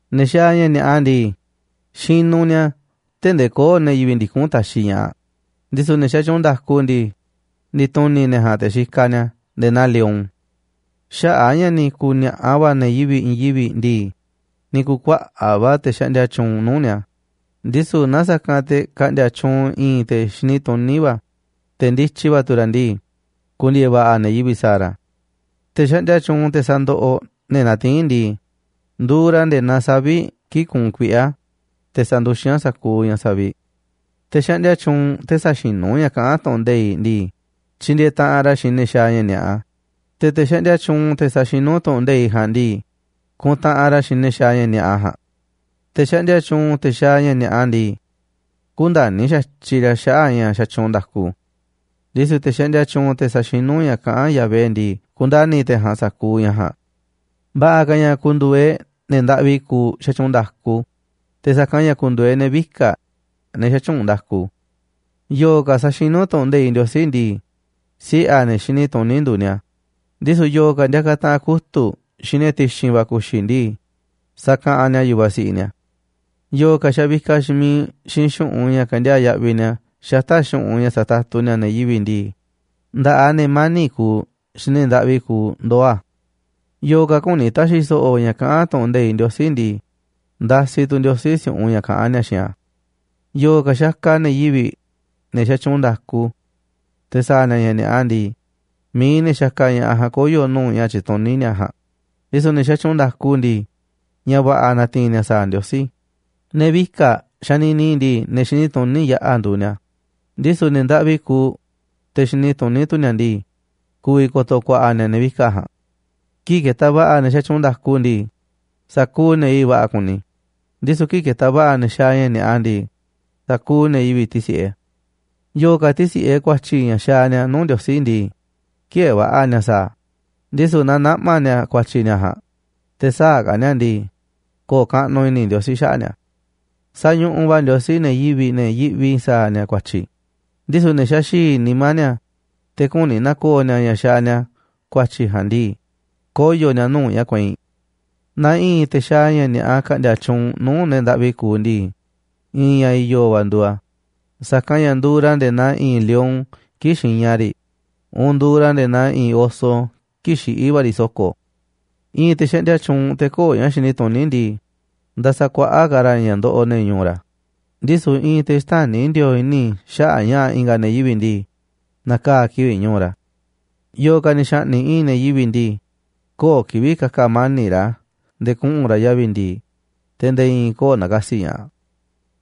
Ne̱ xaaꞌ ña̱ ni̱a̱ꞌa ndii, xinuꞌ ni̱a̱ tee̱ꞌ ndee köo̱ꞌ ne̱ yivi̱ꞌ ndikún taxiꞌ ña̱ꞌaꞌ, ndisu̱ ne̱ xatyuunꞌ nda̱ku ndii, ndi̱tu̱ni̱ ne̱ ja̱a̱nꞌ te̱ xikaꞌ ni̱a̱ nde̱e̱ naa lion. Xaꞌa̱ꞌ a̱ ña̱ ni̱ ku̱ni̱a̱ꞌa va̱ ne̱ yivi̱ꞌ i̱i̱n yivi̱ꞌ ndii, ni̱ ku̱u̱ kuaꞌa̱ꞌ va̱ te̱ xaꞌndia tyuunꞌ nuu̱ꞌ ni̱a̱. Ndisu̱ naaꞌ sa̱kanꞌ te̱ ka̱nꞌdi̱a̱ tyuunꞌ i̱i̱n te̱ xini tuní va̱, te̱ ndityi va̱ tu̱ ra̱ ndii, ku̱ndi̱e̱e̱ va̱ꞌa̱ ne̱ yivi̱ꞌ sa̱a̱ ra̱. Te̱ xaꞌndia tyuunꞌ, te̱ sandoꞌoꞌ ne̱ natiín ndii, nduuꞌ ra̱ nde̱e̱ naa savi̱ꞌ kii̱ꞌ kuunꞌ kuiꞌe̱ a̱, te̱ sanduxín a̱ sa̱kuuꞌ ña̱ saviꞌ. Te̱ xaꞌndia tyuunꞌ, te̱ säxinú ña̱ kaꞌán tu̱ꞌu̱n nde̱iꞌ ndii, tyindieeꞌ taꞌanꞌ ra̱ xiinꞌ ne̱ xaaꞌ ña̱ ni̱a̱ꞌa, te̱ te̱ xaꞌndia tyuunꞌ, te̱ saxinú tu̱ꞌu̱n nde̱iꞌ ja̱a̱nꞌ ndii, kuntaꞌanꞌ ra̱ xiinꞌ ne̱ xaaꞌ ña̱ ni̱a̱ꞌa ja̱a̱nꞌ. Te̱ xaꞌndia tyuunꞌ, te̱ xaaꞌ ña̱ ni̱a̱ꞌa ndii, kündani̱ xa̱tyiꞌ ra̱ xaꞌa̱ꞌ ña̱ xatyuunꞌ nda̱ku, ndisu̱ te̱ xaꞌndia tyuunꞌ, te̱ saxinú ña̱ kaꞌán Yahvé ndii, kundani̱ te̱ ja̱a̱nꞌ sa̱kuuꞌ ña̱ ja̱a̱nꞌ. Va̱ꞌa̱ ka̱ ña̱ ku̱ndu̱u̱ e̱ꞌ ne̱ ndaꞌvi kuuꞌ xatyuunꞌ nda̱ku te̱ sa̱kanꞌ ña̱ ku̱ndu̱u̱ e̱ꞌ ne̱ vika̱ꞌ, ne̱ xätyuunꞌ nda̱ku. Yo̱o̱ ka̱ saxinú tu̱ꞌu̱n nde̱iꞌ Ndiosí ndii, siꞌe̱ a̱ ne̱ xini tuní nduuꞌ ni̱a̱, ndisu̱ yo̱o̱ ka̱ ndiakaꞌ taꞌanꞌ kutu̱ꞌ xiinꞌ ne̱ ti̱xi̱n va̱ ku̱xi̱ ndii, sakaꞌanꞌ ni̱a̱ yu̱vaꞌ siꞌiꞌ ni̱a̱. Yo̱o̱ ka̱ xavikaꞌ xiinꞌ miiꞌ xiinꞌ xu̱ꞌunꞌ ña̱ kendiaa̱ꞌ yaꞌviꞌ ni̱a̱ xata̱ꞌ xu̱ꞌunꞌ ña̱ satatu ni̱a̱ ne̱ yivi̱ꞌ ndii, nda̱ꞌaꞌ ne̱ mani̱ꞌ kuuꞌ xiinꞌ ne̱ ndaꞌvi kuuꞌ ndoo̱ a̱. Yo̱o̱ ka̱ küni ta̱xi̱ so̱ꞌo̱ ña̱ kaꞌán tu̱ꞌu̱n nde̱iꞌ Ndiosí ndii, ndasiꞌ tu̱ Ndiosí si̱u̱ꞌunꞌ ña̱ kaꞌán ni̱a̱ xiinꞌ a̱. Yo̱o̱ ka̱ xakaꞌ ne̱ yivi̱ꞌ, ne̱ xatyuunꞌ nda̱ku, te̱ sa̱a̱ ni̱a̱ ña̱ ni̱a̱ꞌa ndii, mi̱iꞌ ne̱ xakaꞌ ña̱ꞌaꞌ ja̱a̱nꞌ koyo̱ nuu̱ꞌ ña̱ tyituní ni̱a̱ ja̱a̱nꞌ, ndisu̱ ne̱ xatyuunꞌ nda̱ku ndii, ña̱ va̱ꞌa̱ na̱ti̱i̱n ni̱a̱ sa̱a̱ Ndiosí. Ne̱ vika̱ꞌ xanini ndii, ne̱ xini tuní yaꞌa̱ nduuꞌ ni̱a̱, ndisu̱ ne̱ ndaꞌvi kuuꞌ, te̱ xini tuní tu̱ ni̱a̱ ndii, ku̱vi̱ ko̱to̱ ku̱a̱ꞌa̱ ni̱a̱ ne̱ vika̱ꞌ ja̱a̱nꞌ. Kii̱ꞌ ketaꞌ va̱ꞌa̱ ne̱ xatyuunꞌ nda̱ku ndii, sa̱kuuꞌ ne̱ yivi̱ꞌ va̱ꞌa̱ kuni, ndisu̱ kii̱ꞌ ketaꞌ va̱ꞌa̱ ne̱ xaaꞌ ña̱ ni̱a̱ꞌa ndii, sa̱kuuꞌ ne̱ yivi̱ꞌ tisi̱ꞌe. Yo̱o̱ ka̱ tisi̱ꞌe ku̱a̱tyi̱ ña̱ xaaꞌ ni̱a̱ nuu̱ꞌ Ndiosí ndii, ki̱ë̱e̱ va̱ꞌa̱ ni̱a̱ sa̱a̱ a̱, ndisu̱ naaꞌ naꞌma̱ ni̱a̱ ku̱a̱tyi̱ ni̱a̱ ja̱a̱nꞌ, te̱ sä̱a̱ ka̱ ni̱a̱ a̱ ndii, ko̱o̱ kaꞌnuꞌ i̱ni̱ Ndiosí xaꞌa̱ꞌ ni̱a̱. Sañuꞌuꞌ va̱ Ndiosí ne̱ yivi̱ꞌ, ne̱ yiꞌvi sa̱a̱ ni̱a̱ ku̱a̱tyi̱, ndisu̱ ne̱ xaxi̱i̱ nimá ni̱a̱, te̱ küni na̱ko̱o̱ ni̱a̱ ña̱ xaaꞌ ni̱a̱ ku̱a̱tyi̱ ja̱a̱nꞌ ndii, koyo̱ ni̱a̱ nuu̱ꞌ ña̱ kueinꞌ. Naaꞌ i̱i̱n te̱ xaaꞌ ña̱ ni̱a̱ꞌa ka̱ꞌndi̱a̱ tyuunꞌ nuu̱ꞌ ne̱ ndaꞌvi kuuꞌ ndii, i̱i̱n ña̱ i̱yo̱ va̱ nduuꞌ a̱, sa̱kanꞌ ña̱ nduuꞌ ra̱ nde̱e̱ naa i̱i̱n lion kii̱ꞌ xiña riꞌ uun nduuꞌ ra̱ nde̱e̱ naa i̱i̱n oso kii̱ꞌ xiꞌí va̱ riꞌ so̱ko̱. I̱i̱n te̱ xaꞌndia tyuunꞌ, te̱ köo̱ꞌ ña̱ xini tuní ndii, nda̱sa̱kuaꞌa̱ꞌ ka̱ ra̱ ña̱ ndoꞌoꞌ ne̱ ñu̱u̱ ra̱, ndisu̱ i̱i̱n te̱ xtäni̱ ndi̱o̱o̱ꞌ i̱ni̱ xaꞌa̱ꞌ ña̱ꞌa̱ i̱nga̱ ne̱ yivi̱ꞌ ndii, na̱kaa̱ kivi̱ꞌ ñu̱u̱ ra̱. Yo̱o̱ ka̱ ni̱ xa̱ꞌni̱ꞌ i̱i̱n ne̱ yivi̱ꞌ ndii, köo̱ꞌ kivi̱ꞌ ka̱ka̱ mani̱ꞌ ra̱ nde̱e̱ kuꞌu̱n ra̱ yavi̱ ndi̱i̱, te̱ nde̱e̱ i̱i̱n köo̱ꞌ na̱ka̱si̱ ña̱ꞌaꞌ.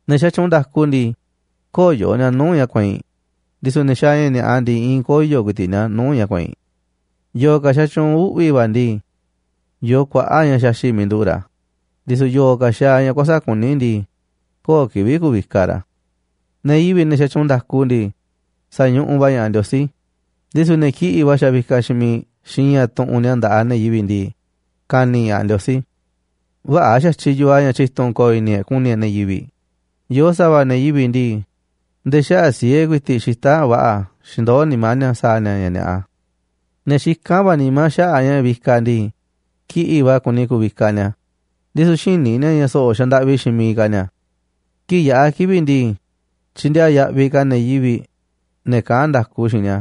Ne̱ xatyuunꞌ nda̱ku ndii, köyo̱ ni̱a̱ nuu̱ꞌ ña̱ kueinꞌ, ndisu̱ ne̱ xaaꞌ ña̱ ni̱a̱ꞌa ndii, i̱i̱n koyo̱ ku̱i̱ti̱ꞌ ni̱a̱ nuu̱ꞌ ña̱ kueinꞌ. Yo̱o̱ ka̱ xatyuunꞌ uꞌvi̱ va̱ ndii, yoo kuaꞌa̱ꞌ ña̱ xaxi̱ꞌ miiꞌ nduꞌu̱ꞌ ra̱, ndisu̱ yo̱o̱ ka̱ xaaꞌ ña̱ kuäsa̱ꞌ kuní ndii, köo̱ꞌ kivi̱ꞌ ku̱vikaꞌ ra̱. Ne̱ yivi̱ꞌ, ne̱ xatyuunꞌ nda̱ku ndii, sa̱ñuꞌuꞌ va̱ ña̱ꞌaꞌ Ndiosí, ndisu̱ ne̱ kiꞌi̱ꞌ va̱ xavikaꞌ xiinꞌ miiꞌ xiinꞌ ña̱ tuꞌunꞌ ni̱a̱ nda̱ꞌaꞌ ne̱ yivi̱ꞌ ndii, ka̱ni̱ ña̱ꞌaꞌ Ndiosí. Vä̱ꞌa̱ xa̱tyiꞌ yoo a̱ ña̱ tyi̱tu̱n ko̱o̱ i̱ni̱ e̱ꞌ ku̱ni̱ e̱ꞌ ne̱ yivi̱ꞌ, yoo sa̱va̱ ne̱ yivi̱ꞌ ndii, nde̱e̱ xaꞌa̱ꞌ siee ku̱i̱ti̱ꞌ xita̱ꞌ va̱ꞌa̱ xindoó nimá ni̱a̱ sa̱a̱ ni̱a̱ ña̱ ni̱a̱ꞌa. Ne̱ xikán va̱ nimá xaꞌa̱ꞌ ña̱ vikaꞌ ndii, kiꞌi̱ꞌ va̱ kuni ku̱vikaꞌ ni̱a̱, ndisu̱ xïní ni̱a̱ ña̱ so̱ꞌo̱ xandaꞌvi xiinꞌ miiꞌ ka̱ ni̱a̱. Kii̱ꞌ yaꞌa̱ kivi̱ꞌ ndii, tyindiaa yaꞌviꞌ ka̱ ne̱ yivi̱ꞌ, ne̱ kaꞌán nda̱ku xiinꞌ ni̱a,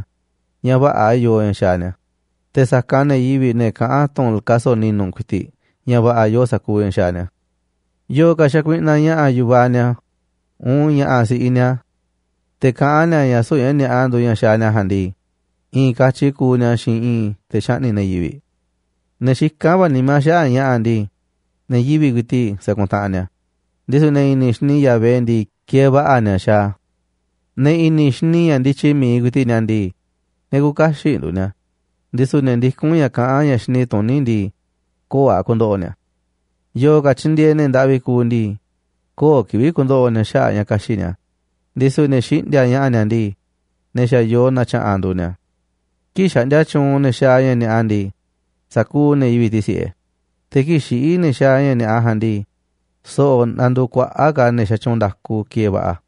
ña̱ vä̱ꞌa̱ yoo ña̱ xaaꞌ ni̱a̱, te̱ sa̱kanꞌ ne̱ yivi̱ꞌ, ne̱ kaꞌán tu̱n kaso̱ꞌ ni̱nu̱ ku̱i̱ti̱ꞌ, ña̱ va̱ꞌa̱ yoo sa̱kuuꞌ ña̱ xaaꞌ ni̱a̱. Yo̱o̱ ka̱ xakuiꞌnaꞌ ña̱ꞌa̱ yu̱vaꞌ ni̱a̱ uun ña̱ꞌa̱ si̱ꞌiꞌ ni̱a̱, te̱ kaꞌán ni̱a̱ ña̱ süu̱ꞌ ña̱ ni̱a̱ꞌa nduuꞌ ña̱ xaaꞌ ni̱a̱ ja̱a̱nꞌ ndii, i̱i̱n katyi kuuꞌ ni̱a̱ xiinꞌ i̱i̱n te̱ xaꞌni̱ꞌ ne̱ yivi̱ꞌ. Ne̱ xikán va̱ nimá xaꞌa̱ꞌ ña̱ꞌa̱ ndii, ne̱ yivi̱ꞌ ku̱i̱ti̱ꞌ sakuntaꞌanꞌ ni̱a̱, ndisu̱ ne̱ i̱ni̱ xini Yahvé ndii, kieeꞌ va̱ꞌa̱ ni̱a̱ xaaꞌ a̱. Ne̱ i̱ni̱ xini ña̱ ndityi mi̱iꞌ ku̱i̱ti̱ꞌ ni̱a̱ ndii, ne̱ küuꞌ kaxiꞌ nduuꞌ ni̱a̱, ndisu̱ ne̱ ndikún ña̱ kaꞌán ña̱ xini tuní ndii, köo̱ꞌ a̱ ku̱ndo̱ꞌo̱ ni̱a̱. Yo̱o̱ ka̱ tyindieeꞌ ne̱ ndaꞌvi kuuꞌ ndii, köo̱ꞌ kivi̱ꞌ ku̱ndo̱ꞌo̱ ni̱a̱ xaꞌa̱ꞌ ña̱ ka̱xi̱ꞌ ni̱a̱, ndisu̱ ne̱ xiꞌndi̱a̱ꞌ ña̱ꞌa̱ ni̱a̱ ndii, ne̱ xa̱ yoo na̱tya̱ꞌa̱nꞌ nduuꞌ ni̱a̱. Kii̱ꞌ xaꞌndia tyuunꞌ ne̱ xaaꞌ ña̱ ni̱a̱ꞌa ndii, sa̱kuuꞌ ne̱ yivi̱ꞌ tisi̱ꞌe, te̱ kii̱ꞌ xiꞌí ne̱ xaaꞌ ña̱ ni̱a̱ꞌa ja̱a̱nꞌ ndii, so̱ꞌo̱ nanduuꞌ kuaꞌa̱ꞌ ka̱ ne̱ xatyuunꞌ nda̱ku kieeꞌ va̱ꞌa̱.